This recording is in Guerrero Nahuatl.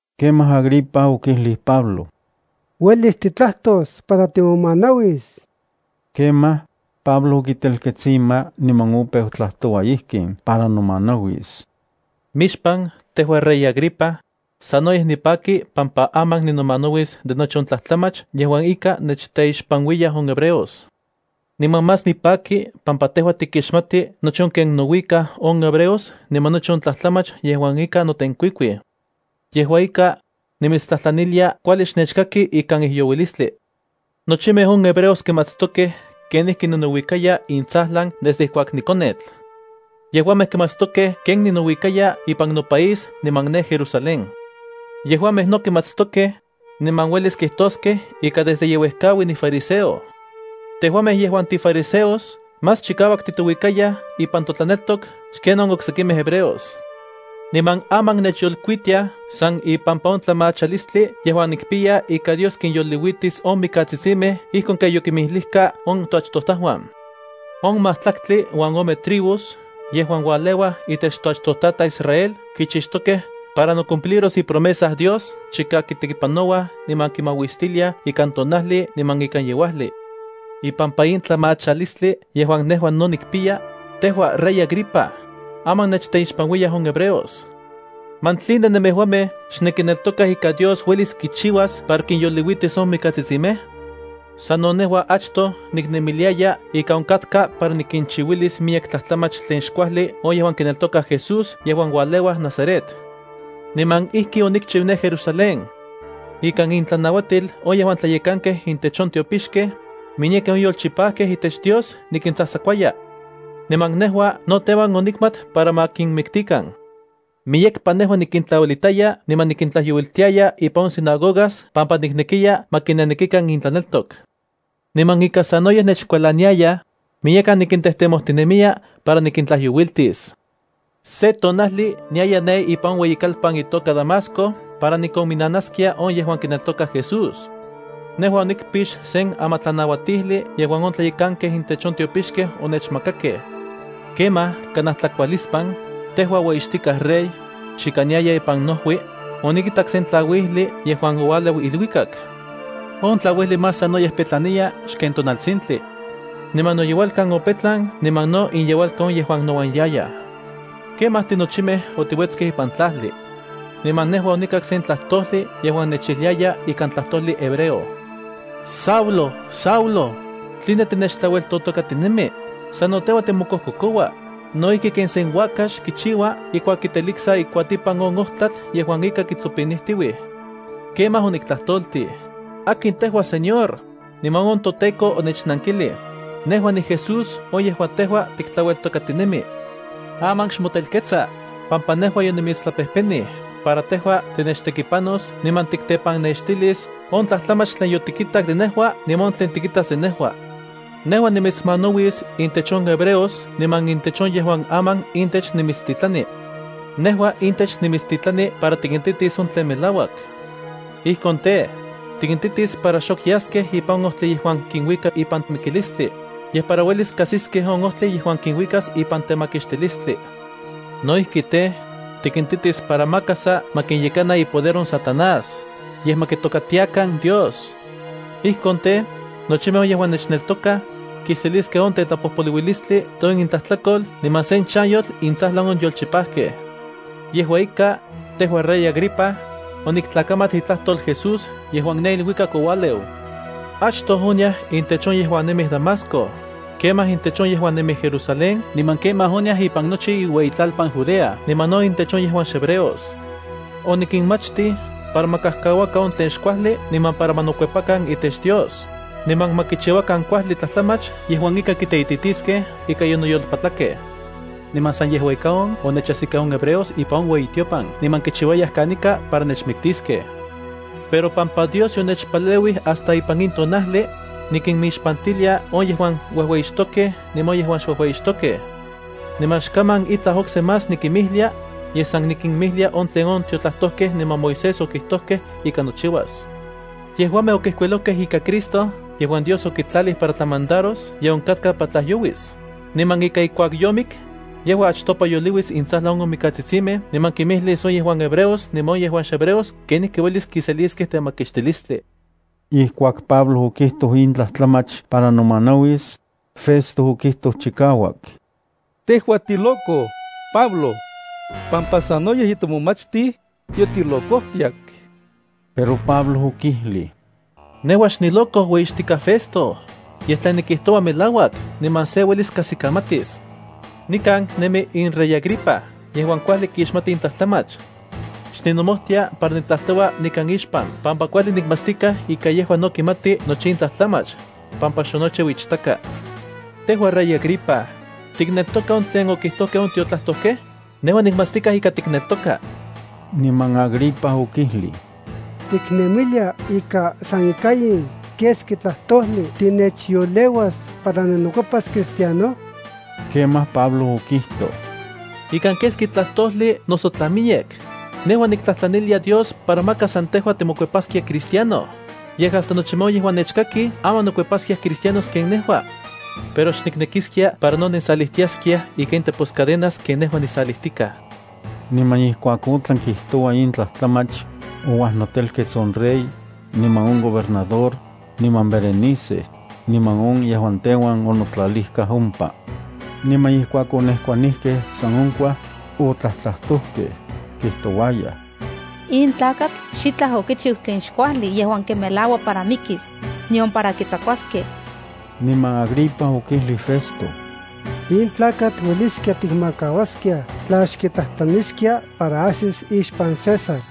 Kemaj Agripa okijlij Pablo: —Uelis titlajtos para timomanauis. Kemaj, Pablo okitelkets ima niman opeu tlajtoua ijkin para nomanauis: —Mixpan tejua rey Agripa, sanoyej nipaki pampa aman ninomanauis de nochi on tlajtlamach yejuan ika nechteixpanuiyaj on hebreos. Niman más nipaki pampa tejua tikixmati nochi on ken nouikaj on hebreos niman nochi on tlajtlamach yejuan ika notenkuikuij. Yejua ika, nimitstlajtlanilia kuajli xnechkaki ikan ijyouilistli. ’Nochimej on hebreos kimatstokej kenijki ninouikaya intsajlan desde ijkuak nikonetl. Yejuamej kimatstokej ken ninouikaya ipan no país niman ne Jerusalén. Yejuamej no kimatstokej, niman uelis kitoskej ika desde ye uejkaui nifariseo. Tejuamej yejuan tifariseos más chikauak titouikayaj ipan totlaneltok xken on oksekimej hebreos. Niman aman nechyolkuitiaj san ipampa on tlamachalistli yejuan nikpiya ika Dios kinyoliuitis on mikatsitsimej ijkon ken yokinmijlijkaj on toachtojtajuan. On majtlaktli uan ome tribus yejuan ualeuaj itech toachtojtataj Israel kichixtokej para nocumpliros ipromesa Dios chika kitekipanouaj niman kimauistiliaj ikan tonajli niman ikan yeuajli. Ipampa in tlamachalistli yejuan nejua no nikpiya, tejua rey Agripa, aman nechteixpanuiyaj on hebreos. ¿Man tline nemejuamej xnenkineltokaj ika Dios uelis kichiuas para kinyoliuitis on mikatsitsimej? ’Sano nejua achtoj niknemiliaya ika onkatka para nikinchiuilis miyek tlajtlamach tlen xkuajli on yejuan kineltokaj Jesús yejuan ualeua Nazaret. Niman ijki onikchiu ne Jerusalén. Ikan intlanauatil on yejuan tlayekankej intech on tiopixkej, miyekej on yolchipajkej itech Dios nikintsajtsakuaya. Niman nejua no teuan onikmat para ma kinmiktikan. Miyekpa nejua nikintlauelitaya niman nikintlajyouiltiaya ipan on sinagogas pampa niknekiya ma kinenekikan intlaneltok. Niman ika sanoyej nechkualaniayaj, miyekan nikintejtemojtinemiya para nikintlajyouiltis. ’Se tonajli niaya ne ipan on ueyikalpan itoka Damasco para nikonminanaskia on yejuan kineltokaj Jesús. Nejua onikpix sen amatlanauatijli yejuan on tlayekankej intech on tiopixkej onechmakakej. Kemaj kanaj tlakualispan, tejua ueyixtika rey, chika niaya ipan nojui, onikitak sen tlauijli yejuan oualeu iluikak. On tlauijli más sanoyej petlaniya xken tonaltsintli. Niman noyeualkan opetlan niman no inyeualkan on yejuan nouan yayaj. Kemaj tinochimej otiuetskej ipan tlajli. Niman nejua onikak sen tlajtojli yejuan nechijliaya ikan tlajtojli hebreo: “Saulo, Saulo, ¿tline tinechtlaueltotokatinemi? Sano tejua timokojkokoua no ijki ken sen uakax kichiua ijkuak kiteliksa ikuatipan on ojtlatl yejuan ika kitsopinijtiuj.” Kemaj oniktlajtoltij: “¿Akin tejua Señor?” Niman on toTEKO onechnankijlij: “Nejua niJesús on yejuan tejua tiktlaueltokatinemi. Aman xmotelkets, pampa nejua yonimitstlapejpenij para tejua tinechtekipanos niman tiktepannextilis on tlajtlamach tlen yotikitak de nejua niman on tlen tikitas de nejua. Nejua nimitsmanauis intech on hebreos niman intech on yejuan aman intech nimitstitlani. Nejua intech nimitstitlani para tikintitis on tlen melauak. Ijkon tej, tikintitis para xok yaskej ipan on ojtli yejuan kinuika para mikilistli, yej para uelis kajsiskej on ojtli yejuan kinuikas ipan temakixtilistli. No ijki tej, tikintitis para maka sa ma kinyekana ipoder on Satanás, yej ma kitokatiakan Dios. Ijkon tej, nochimej on yejuan nechneltokaj kiseliskej on tetlapojpoluilistli de on intlajtlakol niman sen chanyotl intsajlan on yolchipajkej.” ’Yejua ika, tejua rey Agripa, oniktlakamat itlajtol Jesús yejuan ne iluikak oualeu. Achtoj oniaj intech on yejuan nemij Damasco, kemaj intech on yejuan nemij Jerusalén niman kemaj oniaj ipan nochi iueyitlalpan Judea niman no intech on yejuan xhebreos. Onikinmachtij para ma kajkauakan on tlen xkuajli niman para ma nokuepakan itech Dios, niman ma kichiuakan kuajli tlajtlamach yejuan ika kiteititiskej ika yonoyolpatlakej. Niman san yejua ika on onechajsikej on hebreos ipan on ueyitiopan niman kichiuayaj kanika para nechmiktiskej. Pampa Dios onechpaleuij hasta ipan in tonajli, nikinmixpantilia on yejuan uejueyixtokej niman on yejuan xuejueyixtokej. Niman xkaman itlaj okse más nikimijlia, yej san nikinmijlia on tlen on tiotlajtojkej niman Moisés okijtojkej ika nochiuas. Yejuamej okijkuilojkej ika Cristo yejuan Dios okitlalij para tlamandaros ye onkatka para tlajyouis niman ika ijkuak yomik yejua achtopa yoliuis intsajlan on mikatsitsimej, niman kimijlis on yejuan hebreos niman on yejuan xhebreos kenijki uelis kiseliskej temakixtilistli. Ijkuak Pablo okijtoj in tlajtlamach para nomanauis, Festo okijtoj chikauak: —¡Tejua tiloco, Pablo! Pampa sanoyej yotimomachtij, yotilocojtiak. Pero Pablo okijlij: —Nejua xniloco, ueyixtikaj Festo, yej tlen nikijtoua melauak niman se uelis kajsikamatis. Nikan nemi in rey Agripa yejuan kuajli kixmati in tlajtlamach. Xninomojtia para nitlajtoua nikan ixpan pampa kuajli nikmatstikaj ika yejua no kimati nochi in tlajtlamach, pampa xonochiu ichtaka. Tejua rey Agripa, ¿tikneltoka on tlen okijtojkej on tiotlajtojkej? Nejua nikmatstikaj ika tikneltoka. Niman Agripa okijlij: —¿Tiknemilia ika san ika in keski tlajtojli tinechyoleuas para ninokuepas Cristiano? Kemaj Pablo okijtoj: —Ika keski tlajtojli noso tla miyek, nejua niktlajtlanilia Dios para maka san tejua timokuepaskia Cristiano, yej hasta nochimej on yejuan nechkakij, aman nokuepaskiaj Cristianos ken nejua. Pero xniknekiskia para no nensalijtiaskiaj ika in teposcadenas ken nejua nisalijtika. Niman ijkuak otlan kijtoua in tlajtlamach, ouajnotelkets on rey, niman on gobernador, niman Berenice, niman on yejuan teuan onotlalijkaj ompa. Niman ijkuak onejkuanijkej san onkuaj, otlajtlajtojkej, kijtouayaj: —In tlakatl xitlaj okichiu tlen xkuajli yejuan kimelaua para mikis, nion para kitsakuaskej. Niman Agripa okijlij Festo: —In tlakatl ueliskia tikmakauaskiaj tla xkitlajtlaniskia para ajsis ixpan César.